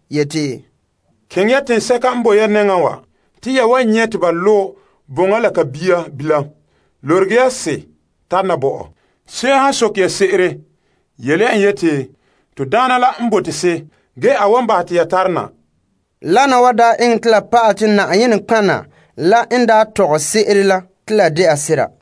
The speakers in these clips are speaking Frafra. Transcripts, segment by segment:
yeti, Keŋɛ ya teŋsɛka n boe ya nɛŋan wa, te ya wan nyɛ' te ba lo' boŋa la ka bia bilam. Lorege ya se tana bo mam. Se'em han soke ya se'ere yele ya en yeti, To Daana la n bote se, ge a wan bahɛ te ya tare na. Wana wa daa eŋɛ te la pa'alɛ la Yenɛ nɔtɔgɔha la n daa tɔgɛ se'ere la te la de sera: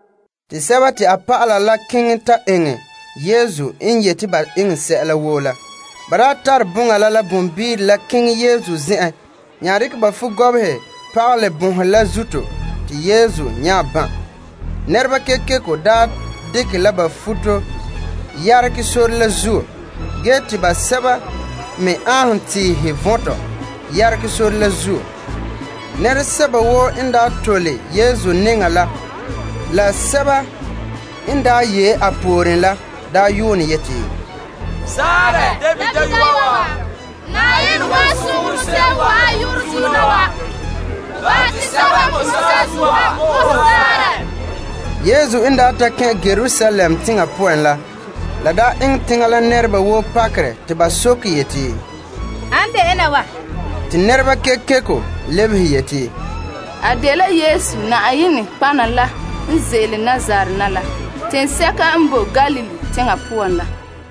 Dɔlɔba la keŋɛ ta eŋɛ Yesu n yeti ba eŋɛ sɛla woo la. Ba tare boŋa la la boŋbire la keŋɛ Yesu zen'en nya dekɛ ba futo pagalɛ boŋhe la zuto te Yesu nya ban'. Nɛreba kekeko dekɛ ba futo yeregɛ sore la zuo ge te basɛba me aanhom tiihe vɔntɔ yeregɛ sore la zuo. Nɛresɛba woo n tole Yesu nɛŋa la, la sɛba n yee a pooren la yuune yeti, Zaarɛ David Dayɔa! Na'ayenɛ wan soŋɛ hon se'em n wa'an a yu'urɛ zuo na wa! Bahɛ te sɛba n boe saazuo ha bo ho zaanrɛ! Yesu n ta kɛn' Yerusalem teŋa poan la, la eŋɛ teŋa nɛreba woo pakerɛ te ba soke yeti, An de ena wa? Te nɛrekooŋɔ lebehe yeti, A de Yesu, Yenɛ nɔtɔgɔha la n ze'ele Nazaret teŋsɛka n boe Galilee teŋa la.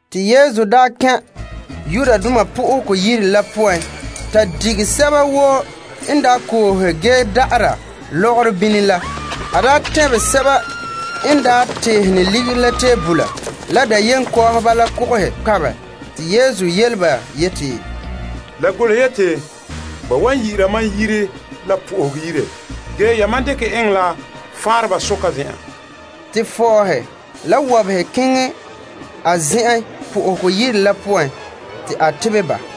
Yesu daa kɛn' Yenɛ Yire la poan ta dige sɛba woo n daa koohe ge da'ara lɔgɔrɔ bini la. A tɛnbɛ sɛba n daa teehene ligiri la tebola la dayenkɔɔhɔba la kogohe kpabɛ. Te Yesu yele ba yeti, La golehe te, Mam yire la yu'urɛ wan yi'ira la po'ohegɔ yire ge yamam dekɛ dɛ lebege faanreba soka zen'an. Te fɔɔhe la wɔbehe keŋɛ a zen'en Yenɛ Yire la poan te a tebɛ ba.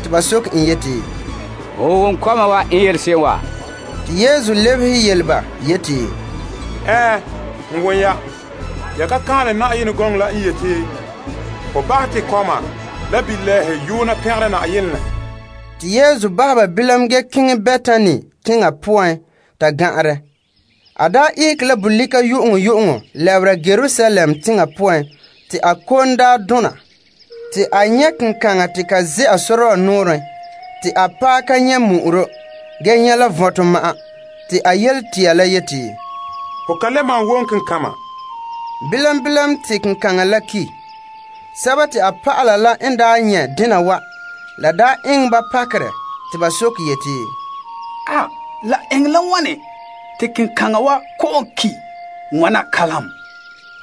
Ba soke en yeti, Ho wom kɔma wa n yele se'em wa? Te Yesu lebehe yele ba yeti, Ɛɛn, n wom ya. Ya ka kaanlɛ te, Hom paŋa pon nɛɛ mɛ te kɔma la kɔmbilɛɛhe n pɛngere hom se'em la? Te Yesu bahɛ ba bilam ge keŋɛ Betani teŋa poan ta gan'anrɛ. A daa ihege la bolika yu'uŋyu'uŋɔ lɛbera Yerusalem teŋa poan te a kom daa dona. Te a nyɛ' kenkaŋa te ka zɛ'a sɔrɔɔ nɔɔrɛn te a paɛ ka nyɛ' mu'uro ge nyɛ' la vɔntɔ ma'an. Te a yele tia la yeti, Ho ka le malom wom kenkama. Bilam bilam te kenkaŋa la ki'. A dɔlɔba la n da nyɛ' dena wa, la daa eŋɛ ba pakerɛ te ba soke yeti, La eŋɛ la wane te kenkaŋa wa kɔ'ɔn ki' wana kalam?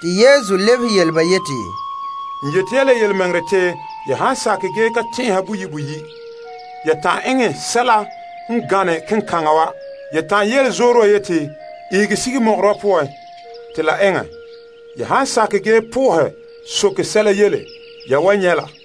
Yesu lebehe yele ba yeti, N yeti ya la yelemɛŋɛrɛ te ya han sakɛ ge ka tɛn'ɛha boyi' boyi', ya ta'an eŋɛ sɛla n gane kenkaŋa wa, ya ta'an yele zoore wa yeti, ihege sige ko'kantɛ wa poan, te la eŋɛ. Ya han sakɛ ge sohɛ sɛla yele, ya wan nyɛ' la.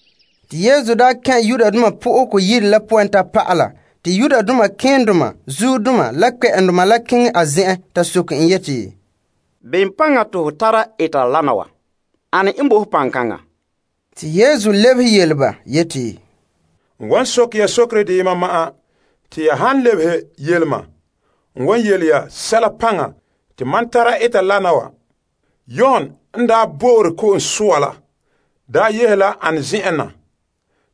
Te Yesu daa kɛn' Yenɛ Yire zenzagahe la poan ge n ta pa'ala, malema keendoma la kpɛ'ɛndoma keŋɛ a zen'en ta soke en yeti, Bem paŋa te ho tara eta wana wa? Ane n bo ho sore? Yesu lebehe yele ba yeti, N wan soke ya sokere deyema ma'an te ya han lebehe yele ma, n wan yele ya sɛla paŋa te mam tara eta wana wa. Yon n daa bo'ore ko'om soa la daa yehe la ane zen'en na?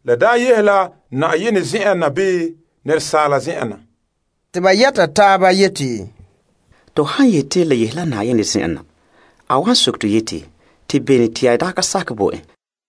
La daa yehe la Yenɛ zen'en na bii asaala zen'en na? Te ba yɛta taaba yeti, To han yeti la yahe la Yenɛ zen'en na, a wan soke to yeti, Te bene te ya daa ka sakɛ bo en?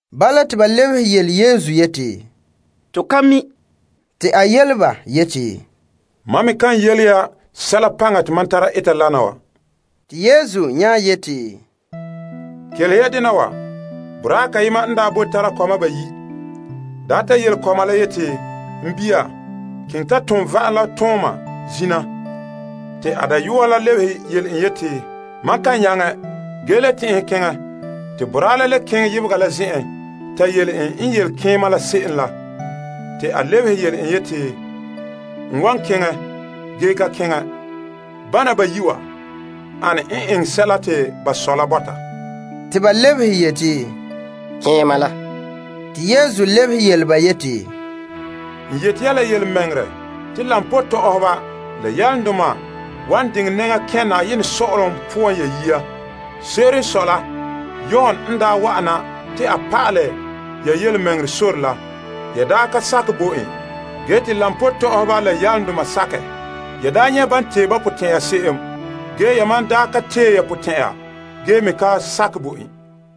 Bala te ba lebehe yele Yesu yeti, To ka mi'. Te a yele ba yeti, Mam me kan yele ya sɛla paŋa te mam tara eta wana wa. Ya tɛnhe la bem? Boraa kayema n daa boe tara kɔma bayi', ta yele keema la yeti, N bia, keŋɛ ta tom va'am la tooma zina. Bia la lebehe yeti, Mam kan nyaŋɛ. Ge te a le tɛn'ɛhɛ keŋɛ. Boraa la nya keŋɛ yebega la zen'en ta yele en n yele keema la se'em la. Te a lebehe yele en yeti, N wan keŋɛ. Ge a ka keŋɛ. Bana bayi' wa, ane n eŋɛ sɛla te ba sɔ la bɔta? Ba lebehe yeti, Keema la. Yesu lebehe yele ba yeti, N yeti ya la yelemɛŋɛrɛ te koba tɔ'ɔhɔba la yalomdoma wan diŋɛ nɛŋa kɛn' Yenɛ sɔ'ɔlom poan ya yia. Se'ere n sɔe la Yon n wa'ana te a pa'alɛ ya yelemɛŋɛrɛ sore la, ya ka sakɛ bo en. Ge te koba tɔ'ɔhɔba la yalomdoma sakɛ. Yan nyɛ' te ba tee ba potɛn'ɛra se'em, yamam ka tee ya potɛn'ɛra ge me ka sakɛ bo en.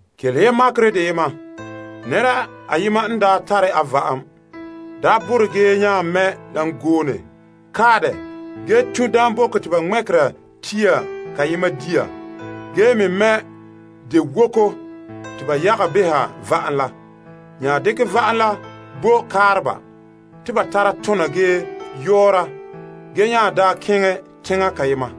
Kelehe ya makerɛ deyema. Nɛra ayema n daa tare a va'am, borɛ ge nya mɛ' dangoone kae dɛ ge tun' daamboko te ba ŋmɛkera tiihe wɔla, ge le mɛ' dewoko te ba yaga beha va'am la. A nya dekɛ va'am la bo kaareba te ba tara tona ge yɔɔra ba, ge nya keŋɛ teŋa kayema.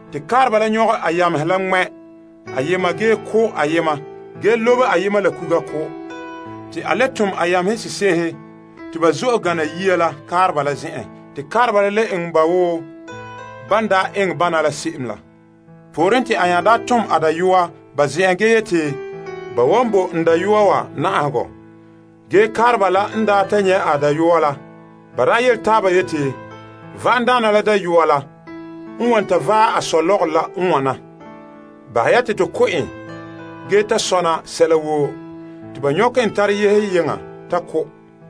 Te kaareba la nyɔgɛ a yamehe la ŋmɛ' ayema ge ko' ayema ge lobe ayema la kuga. Te a nya tom a yamehe sese'ehe te ba zo'e gana yia la kaareba la zen'en. Te kaareba la le eŋɛ ba woo ban daa eŋɛ bana la se'em la. Pooren te a nya tom a dayɔa ba zen'en ge yeti, Ba wan bo n dayɔa wa na'ahegɔ. Ge kaareba la n ta nyɛ' a dayɔa la, ba yele taaba yeti, Va'amdaana la dayɔa la n wan ta vaɛ a sɔ lɔgɔrɔ la n wana. Bahɛ ya te to ko' en ge ta sɔna sɛla woo. Te ba nyɔkɛ en tare yehe yeŋa ta ko'.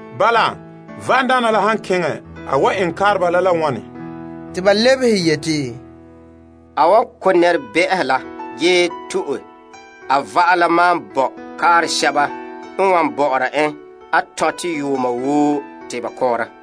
Bala la, va'amdaana la han keŋɛ, a wan eŋɛ kaareba la la wane? Te ba lebehe yeti, A wan ko' nɛrebɛ'ɛhe wa ge to'e a va'am la maan bo kaaresɛba n wan bɔ'ɔra en a tɔntɛ yuuma woo te ba kɔɔra.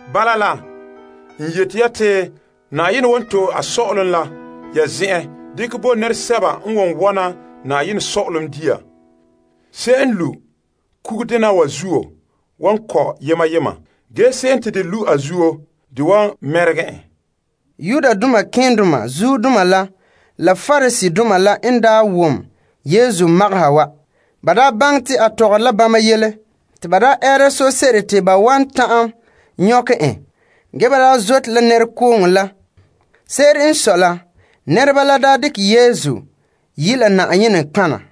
Bala la, n yeti ya te Yenɛ wan to'e a sɔ'ɔlom la ya zen'en dekɛ bo nɛresɛba n wan wɔna Yenɛ sɔ'ɔlom dia. Se'em n lu' kugudena wa zuo wa kɔ' yema yema, ge se'em te de lu' a zuo de wan ŋmaɛ en. Malema keendoma la Pariseedoma n daa ta wom Yesu magaha wa, ba baŋɛ te a tɔgɔre la bama yele. Te ba ɛɛra sose'ere te ba wan ta'an nyɔkɛ en ge ba zote la nɛrekooŋɔ la. Se'ere n sɔe la, nɛreba la daa dekɛ Yesu yi' en la Na'ayenɛ nɔtɔgɔha.